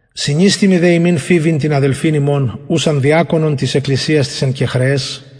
συνιστημι δε υμιν φοιβην την αδελφην ημων ουσαν διακονον της εκκλησιας της εν κεγχρεαις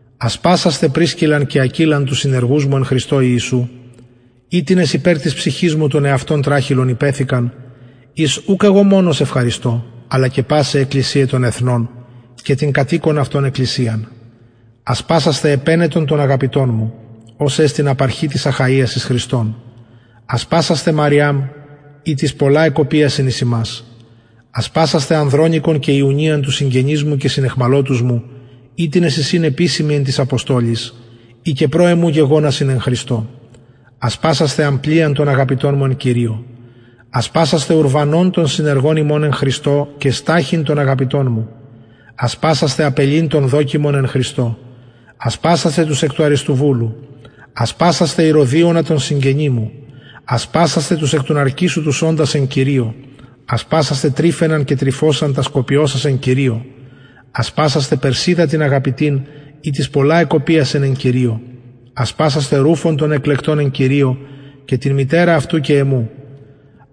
ασπασασθε πρισκαν και ακυλαν τους συνεργους μου εν χριστω ιησου οιτινες υπερ της ψυχης μου τον εαυτων τραχηλον υπεθηκαν οις ουκ εγω μονος ευχαριστω αλλα και πασαι αι εκκλησιαι των εθνων και την κατ οικον αυτων εκκλησιαν ασπασασθε επαινετον τον αγαπητον μου ος εστιν απαρχη της αχαιας εις χριστον ασπασασθε μαριαμ ητις πολλα εκοπιασεν εις ημας ασπασασθε ανδρονικον και ιουνιαν τους συγγενεις μου και συναιχμαλωτους μου οιτινες εισιν επισημοι εν τοις αποστολοις οι και προ εμου γεγονασιν εν χριστω ασπασασθε αμπλιαν τον αγαπητον μου εν κυριω ασπασασθε ουρβανον τον συνεργον ημων εν χριστω και σταχυν τον αγαπητον μου ασπασασθε απελλην τον δοκιμον εν χριστω ασπασασθε τους εκ των αριστοβουλου ασπασασθε ηρωδιωνα τον συγγενη μου ασπασασθε τους εκ των ναρκισσου τους οντας εν κυριω ασπασασθε τρυφαιναν και τρυφωσαν τας κοπιωσας εν κυριω ασπασασθε περσιδα την αγαπητην ητις πολλα εκοπιασεν εν κυριω ασπασασθε ρουφον τον εκλεκτον εν κυριω και την μητερα αυτου και εμου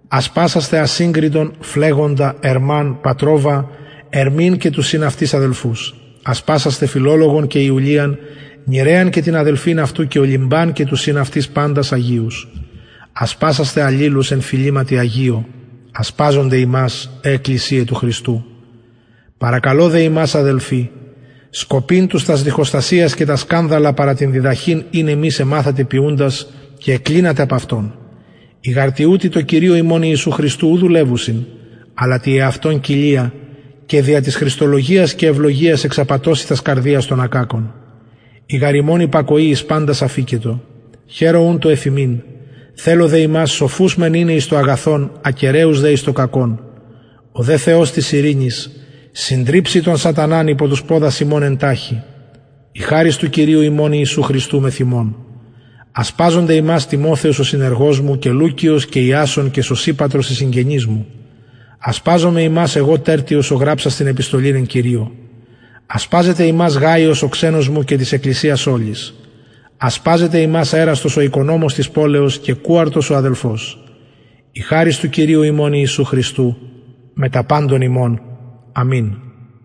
ασπασασθε ασυγκριτον φλεγοντα ερμαν πατροβαν ερμην και τους συν αυτοις αδελφους ασπασασθε φιλολογον και ιουλιαν νηρεα και την αδελφην αυτου και ολυμπαν και τους συν αυτοις παντας αγιους ασπασασθε αλληλους εν φιληματι αγιω ασπαζονται υμας αι εκκλησιαι του χριστου παρακαλω δε υμας αδελφοι σκοπειν τους τας διχοστασιας και τα σκανδαλα παρα την διδαχην ην υμεις εμαθετε ποιουντας και εκκλινατε απ αυτων οι γαρ τοιουτοι τω κυριω ημων ιησου χριστω ου δουλευουσιν αλλα τη εαυτων κοιλια και δια της χρηστολογιας και ευλογιας εξαπατωσιν τας καρδιας των ακακων η γαρ υμων υπακοη εις παντας αφικετο χαιρω ουν το εφ υμιν θελω δε υμας σοφους μεν ειναι εις το αγαθον ακεραιους δε εις το κακον ο δε θεος της ειρηνης συντριψει τον σαταναν υπο τους ποδας υμων εν ταχει η χαρις του κυριου ημων ιησου χριστου μεθ υμων ασπαζονται υμας τιμοθεος ο συνεργος μου και λουκιος και ιασων και σωσιπατρος οι συγγενεις μου ασπαζομαι υμας εγω τερτιος ο γραψας την επιστολην εν κυριω ασπαζεται υμας γαιος ο ξενος μου και της εκκλησιας ολης ασπαζεται υμας εραστος ο οικονομος της πολεως και κουαρτος ο αδελφος η χαρις του κυριου ημων ιησου χριστου μετα παντων υμων αμην